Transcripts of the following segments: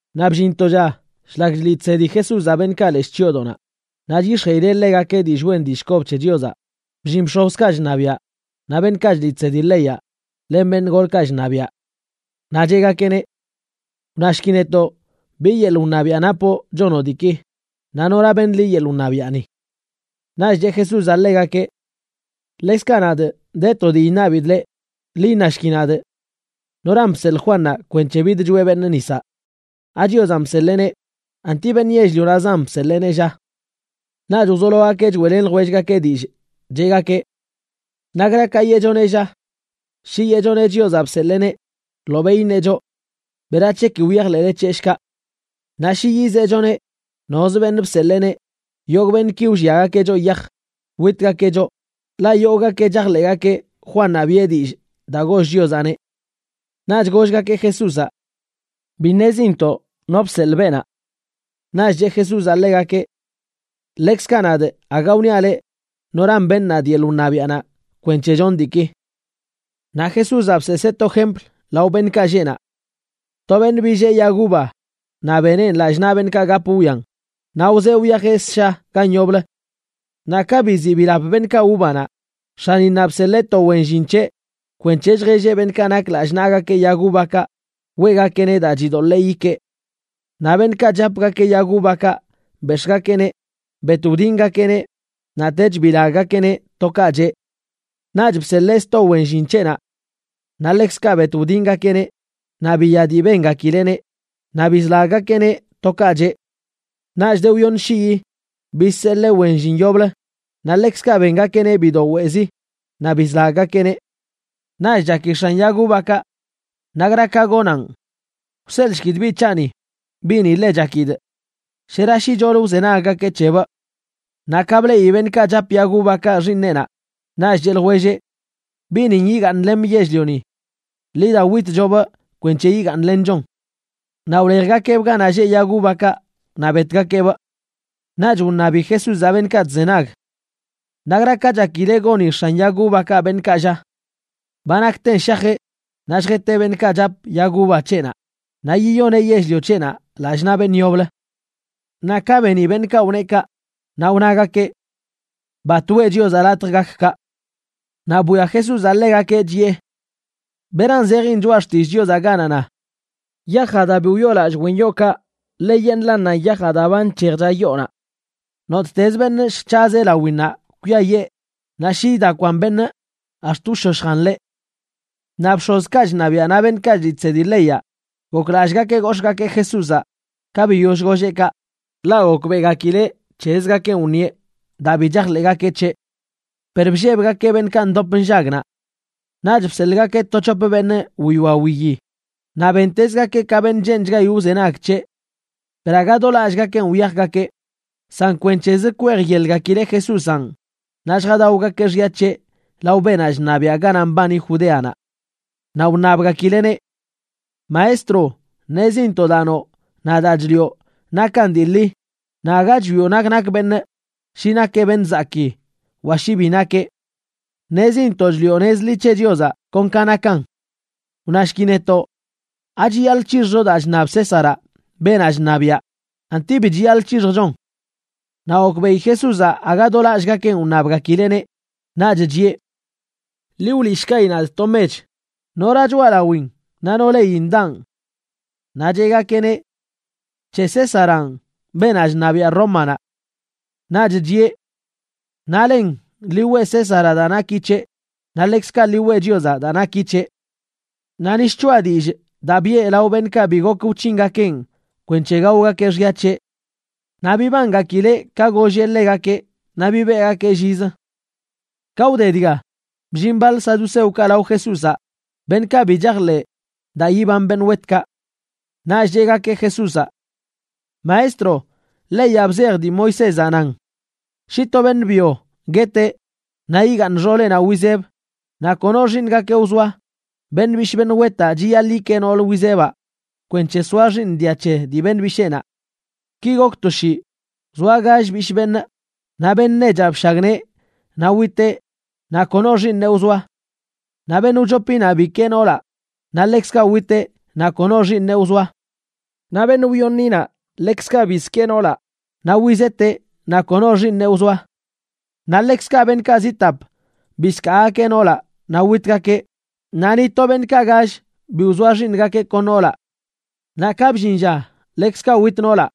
Naꞌ bllin to lla, shlak chliꞌ chsedi Jesúzaꞌ beṉꞌkaꞌ leshꞌ chyoodoꞌnaꞌ naꞌ chyix̱jeꞌileꞌ ḻegakeꞌ dillꞌ wen dillꞌ kob c̱he Chiozaꞌ, bllin bx̱ozkaꞌ chṉabiaꞌ naꞌ beṉꞌkaꞌ chliꞌ chsedi leyaꞌ len beṉꞌ golkaꞌ chṉabiaꞌ. Naꞌ cheꞌgakeꞌneꞌ: ―Wnashki netoꞌ, ¿bi yeḻꞌ wṉabiaꞌ napoꞌ chonoꞌ diiki? Naꞌ ¿nora beṉ liꞌ yeḻꞌ wṉabiaꞌni? Naꞌch cheꞌ Jesúzaꞌ ḻegakeꞌ: ―Ḻekzkaꞌ nadꞌ de to dii iṉabidꞌ leꞌ, ḻi iṉashki nadꞌ: ¿Noran bseḻꞌ Juannaꞌ kwenc̱he bidchoeꞌ beṉꞌ nisaꞌ? ¿AChiozanꞌ bseḻeeneꞌ? ¿Anti beṉꞌ yell-lionaꞌzan bseḻeeneꞌ, lla? Naꞌch wzologakeꞌ choeꞌlen ljwellgakeꞌ dillꞌ, cheꞌgakeꞌ: ―¿Nakra ka yeꞌchoneꞌ, lla? Shi yeꞌchoneꞌ Chiozaꞌ bseḻeeneꞌ, ḻobeꞌ iṉeꞌ choꞌ: “¿Berac̱he ki wyajḻeꞌle c̱heꞌ, shkaꞌ?” Naꞌ shi yizeꞌchoneꞌ nozə beṉꞌ bseḻeeneꞌ, yogꞌ beṉꞌki wlliagakeꞌ choꞌ yaj witgakeꞌ choꞌ, ḻaꞌ yogꞌgakeꞌ chajḻeꞌgakeꞌ Juannaꞌ biꞌe dillꞌ daa goll Chiozaꞌneꞌ. Naꞌch gollgakeꞌ Jesúzaꞌ: ―Bi ṉezintoꞌ no bseḻꞌ beenaꞌ. Naꞌch cheꞌ Jesúzaꞌ ḻegakeꞌ: ―Ḻekzkaꞌ nadꞌ aga wniaꞌ leꞌ noran beṉ nadꞌ yeḻꞌ wṉabiaꞌnaꞌ kwenc̱he chonꞌ diiki. Naꞌ Jesúzaꞌ bseesee to jempl lao beṉꞌkaꞌ lleꞌ naꞌ: ―To beṉꞌ billee yag uva, naꞌ beneꞌn lallꞌ naꞌ beṉꞌkaꞌ gap wwian, naꞌ wzee wyajeꞌ ssha gan yoblə. Naꞌ ka biziꞌ bilap beṉꞌkaꞌ uvanaꞌ, x̱aninnaꞌ bseḻee to wen llin c̱heꞌ kwenc̱he lljelleꞌ beṉꞌkaꞌ nak lallꞌ naꞌgakeꞌ yag uvakaꞌ weꞌgakeꞌneꞌ daa chidoḻee yikee. Naꞌ beṉꞌkaꞌ chapgakeꞌ yag uvakaꞌ bex̱ꞌgakeꞌneꞌ bet wdingakeꞌneꞌ, naꞌtech bilaggakeꞌneꞌ to kaꞌ cheꞌ. Naꞌch bseḻee sto wen llin c̱heꞌnaꞌ. Naꞌ ḻekzkaꞌ bet wdingakeꞌneꞌ, naꞌ biya dii bengakileꞌneꞌ, naꞌ bizlaggakeꞌneꞌ to kaꞌ cheꞌ. Naꞌch de wyoṉ shii, bizseḻee wen llin yoblə, naꞌ ḻekzkaꞌ bengakeꞌneꞌ bido weꞌzi, naꞌ bizlaggakeꞌneꞌ. ’Naꞌch chaki x̱an yag uvakaꞌ: “¿Nakra ka gonaꞌn? Wseḻꞌshkidꞌ biꞌ c̱haꞌni, biꞌni ḻe chakidꞌ. Shera shicholə wzenaggakeꞌ c̱hebꞌ.” Naꞌ ka bleꞌi beṉꞌkaꞌ chap yag uvakaꞌ xiiṉeꞌnaꞌ, naꞌch cheꞌ ljwelleꞌ: “Biꞌnin yigaaṉlemꞌ yell-lioni. Ḻi da witchobꞌ kwenc̱he yigaaṉlenchon.” Naꞌ wlejgakeꞌbꞌ ganaꞌ lleꞌ yag uvakaꞌ naꞌ betgakeꞌbꞌ. Naꞌch wṉabi Jesúzaꞌ beṉꞌkaꞌ chzenag: ―¿Nakra ka chakile goni x̱an yag uvakaꞌ beṉꞌkaꞌ, lla? Ba nakten shajeꞌ naꞌ lljeteꞌ beṉꞌkaꞌ chap yag uva c̱heꞌnaꞌ naꞌ yiyoneꞌ yell-lio c̱heꞌnaꞌ lallꞌ naꞌ beṉꞌ yoblə. Naꞌ ka beni beṉꞌkaꞌ wneꞌ kaꞌ, naꞌ wnagakeꞌ: ―¡Bat weꞌ Chiozaꞌ latj gak kaꞌ! Naꞌ bwia Jesúzaꞌ ḻegakeꞌ, chiꞌe: ―¿Beran zejin Choꞌa Xtillꞌ Chiozaꞌ ganaꞌ na: Yajaꞌ daa bi wyoolallꞌ wen yookaꞌ, ḻeyeṉꞌlannanꞌ yajaꞌ daa ba nc̱hejcha yoonaꞌ? Nottezə beṉꞌ lljc̱hazeꞌ lawinnaꞌ kwiayee, naꞌ shi idakwan beṉꞌ, ax̱t wshoshjan ḻeꞌ. Naꞌ bx̱ozkaꞌ chṉabiaꞌ naꞌ beṉꞌkaꞌ chliꞌ chsedi leyaꞌ goklallꞌgakeꞌ gox̱ꞌgakeꞌ Jesúzaꞌ ka biyoll golleꞌ kaꞌ, ḻaꞌ gokbeꞌgakileꞌ c̱hezgakenꞌ wṉieꞌ daa bi chajḻeꞌgakeꞌ c̱heꞌ. Per bllebgakeꞌ beṉꞌkaꞌ ndop nllag naꞌ. Naꞌch bseḻꞌgakeꞌ to c̱hop beṉꞌ wiwia wiyi, naꞌ bentezgakeꞌ ka beṉꞌ cheenchgayi wzenag c̱heꞌ. Per aga do lallꞌgakenꞌ wyajgakeꞌ, san kwenc̱hezə kwejyelgakileꞌ Jesúzanꞌ naꞌ lljadaogakeꞌ xya c̱heꞌ lao beenaꞌ chṉabiaꞌ ganaꞌ mbani Judeanaꞌ. Naꞌ wṉabgakileꞌneꞌ: ―Maestro, ṉezintoꞌ daa noꞌ naꞌ daa chliꞌo nakan dii ḻi, naꞌ aga chwioꞌ nak nak beṉꞌ, shi nakeꞌ beṉꞌ zakii wa shi bi nakeꞌ. Ṉezintoꞌ chliꞌo nez ḻi c̱he Chiozaꞌ kon ka nakan. Wnashki netoꞌ: ¿Achiyaḻꞌ c̱hixjcho daa chṉab Césaraꞌ, beenaꞌ chṉabiaꞌ, anti bi chiyaḻꞌ c̱hixjchon? Naꞌ gokbeꞌi Jesúzaꞌ aga do lallꞌgakenꞌ wṉabgakileꞌneꞌ, naꞌch chiꞌe: ―Ḻi wliꞌshkayi nadꞌ to mech. ¿Nora choꞌalawin naꞌ no leyin daꞌn? Naꞌ cheꞌgakeꞌneꞌ: ―C̱he Césaranꞌ, beenaꞌ chṉabiaꞌ Rómanaꞌ. Naꞌch chiꞌe: ―Naꞌlen, ḻi weꞌ Césaraꞌ daa naki c̱heꞌ, naꞌ ḻekzkaꞌ ḻi weꞌ Chiozaꞌ daa naki c̱heꞌ. Naꞌ ni shchoꞌa dillꞌ daa biꞌe lao beṉꞌkaꞌ bi gok wc̱hingakeꞌn kwenc̱he gaogakeꞌ xya c̱heꞌ. Naꞌ bibangakileꞌ ka golleꞌ ḻegakeꞌ naꞌ bibeꞌgakeꞌ llizə. Ka wde dga, bllin baḻ saduceokaꞌ lao Jesúzaꞌ, beṉꞌkaꞌ bi chajḻeꞌ daa yiban beṉꞌ wetkaꞌ. Naꞌch cheꞌgakeꞌ Jesúzaꞌ: ―Maestro, leyaꞌ bzej dii Moisézaꞌ nan: shi to beṉꞌ byo gueteꞌ naꞌ igaaṉ xooleꞌnaꞌ wizeb naꞌ kono xiiṉgakeꞌ wzoa, beṉꞌ bishꞌ beṉꞌ wetaꞌ chiyaḻꞌ yikee nool wizebaꞌ kwenc̱he soa xiiṉ dia c̱he dii beṉꞌ bisheenaꞌ. Ki gok to shii, wzoa gall bishꞌ beṉꞌ, naꞌ beṉꞌ nechaꞌ bshagnee, naꞌ witeꞌ naꞌ kono xiiṉeꞌ wzoa. Naꞌ beṉꞌ wchopinaꞌ bikee noolaꞌ, naꞌ ḻekzkaꞌ witeꞌ naꞌ kono xiiṉeꞌ wzoa. Naꞌ beṉꞌ wyoṉinaꞌ, ḻekzkaꞌ bizkee noolaꞌ, naꞌ wizeteꞌ naꞌ kono xiiṉeꞌ wzoa. Naꞌ ḻekzkaꞌ beṉꞌkaꞌ zi tap bizkaagakeꞌ noolaꞌ naꞌ witgakeꞌ, naꞌ ni to beṉꞌkaꞌ gall bi wzoa xiiṉgakeꞌ kon noolaꞌ. Naꞌ ka bllin lla ḻekzkaꞌ wit noolaꞌ.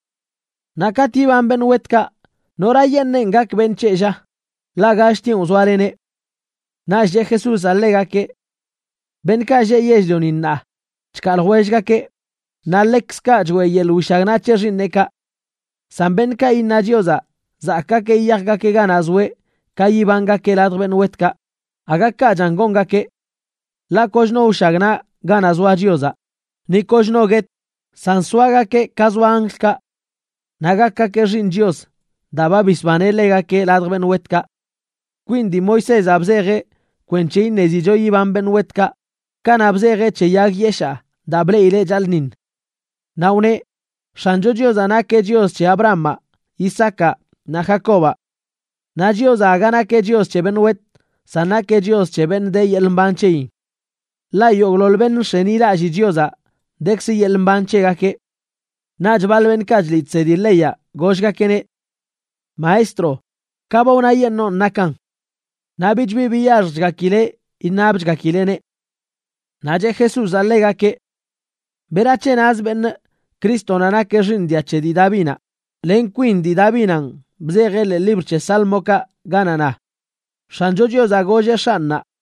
Naꞌ katꞌ yiban beṉꞌ wetkaꞌ, ¿norayeṉꞌenꞌ gak beṉꞌ c̱heꞌ, lla?, ḻaꞌ galltienꞌ wzoaleneꞌ. Naꞌch cheꞌ Jesúzaꞌ ḻegakeꞌ: ―Beṉꞌkaꞌ lleꞌ yell-lioni ṉaa chkaa ljwellgakeꞌ, naꞌ ḻekzkaꞌ choeꞌ yeḻꞌ wishagnaꞌ c̱he xiiṉeꞌkaꞌ. San beṉꞌkaꞌ iṉa Chiozaꞌ zakꞌgakeꞌ yiyajgakeꞌ ganaꞌ zoeꞌ ka yibangakeꞌ ladj beṉꞌ wetkaꞌ, aga kaꞌchan gongakeꞌ. Ḻaꞌ koch no wshagnaꞌ ganaꞌ zoa Chiozaꞌ, ni koch no guet, san soagakeꞌ ka zoa anjlkaꞌ. Naꞌ gakgakeꞌ xiiṉ Chios daa ba bisbaneꞌ ḻegakeꞌ ladj beṉꞌ wetkaꞌ. Kwin dii Moisézaꞌ bzejeꞌ kwenc̱he iṉezicho yiban beṉꞌ wetkaꞌ kanaꞌ bzejeꞌ c̱he yag yeshaa daa bleꞌileꞌ chaḻꞌṉiṉ. Naꞌ wneꞌ X̱ancho Chiozaꞌ nakeꞌ Chios c̱he Abrahamaꞌ, Isaacaꞌ naꞌ Jacobaꞌ. Naꞌ Chiozaꞌ aga nakeꞌ Chios c̱he beṉꞌ wet, san nakeꞌ Chios c̱he beṉꞌ de yeḻꞌ mban c̱heyin. Ḻaꞌ yogꞌḻoḻ beṉꞌ nx̱enilallii Chiozaꞌ, dekzə yeḻꞌ mban c̱hegakeꞌ. Naꞌch baḻ beṉꞌkaꞌ chliꞌ chsedi leyaꞌ gollgakeꞌneꞌ: ―Maestro, ka ba wnayeṉoon nakan. Naꞌ bich bi biyaxjchgakileꞌ iṉabchgakileꞌneꞌ. Naꞌ cheꞌ Jesúzaꞌ ḻegakeꞌ: ―¿Berac̱he nazə beṉꞌ Crístonaꞌ nakeꞌ xiiṉ dia c̱he dii Davinaꞌ?, len kwin dii Davinanꞌ bzejeꞌ ḻee libr c̱he Sálmokaꞌ ganaꞌ na: X̱ancho Chiozaꞌ golleꞌ X̱anꞌnaꞌ: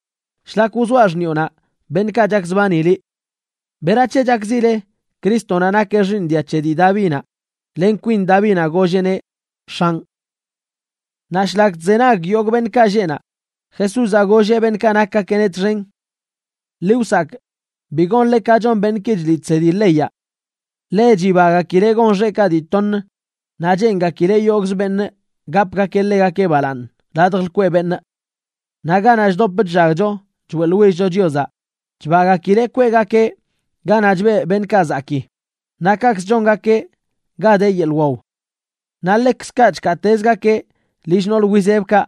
shlak wzoaꞌ xṉiꞌonaꞌ beṉꞌkaꞌ chakzbani liꞌ.” ¿Berac̱he chakzile Crístonaꞌ nakeꞌ xiiṉ dia c̱he dii Davinaꞌ, len kwin Davinaꞌ golleꞌneꞌ: “X̱anꞌ”? Naꞌ shlak chzenag yogꞌ beṉꞌkaꞌ lleꞌ naꞌ, Jesúzaꞌ golleꞌ beṉꞌkaꞌ nakgakeꞌneꞌ txen: ―Ḻi wsakꞌ bi gonle ka chon beṉꞌki chliꞌ chsedi leyaꞌ. Ḻe chibagakileꞌ gon xeꞌkaꞌ dii toṉ, naꞌ cheengakileꞌ yogꞌzə beṉꞌ gapgakeꞌ ḻegakeꞌ balaaṉ ladj lkweꞌ beṉꞌ. Naꞌ ganaꞌ chdop chllagcho choeꞌḻwillcho Chiozaꞌ chbagakileꞌ kweꞌgakeꞌ ganaꞌ chbeꞌ beṉꞌkaꞌ zakii, naꞌ kaꞌkzə chongakeꞌ ga de yeḻꞌ waw. Naꞌ ḻekzkaꞌ chkaatezgakeꞌ lill nool wizebkaꞌ,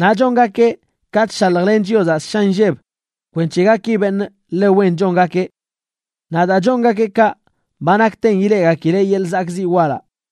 naꞌ chongakeꞌ ka chshaljlen Chiozaꞌ ssha nlleb kwenc̱he gaki beṉꞌ ḻe wen chongakeꞌ. Naꞌ daa chongakeꞌ kaꞌ, ba nakten ileꞌgakileꞌ yeḻꞌ zakꞌziꞌ walaꞌ.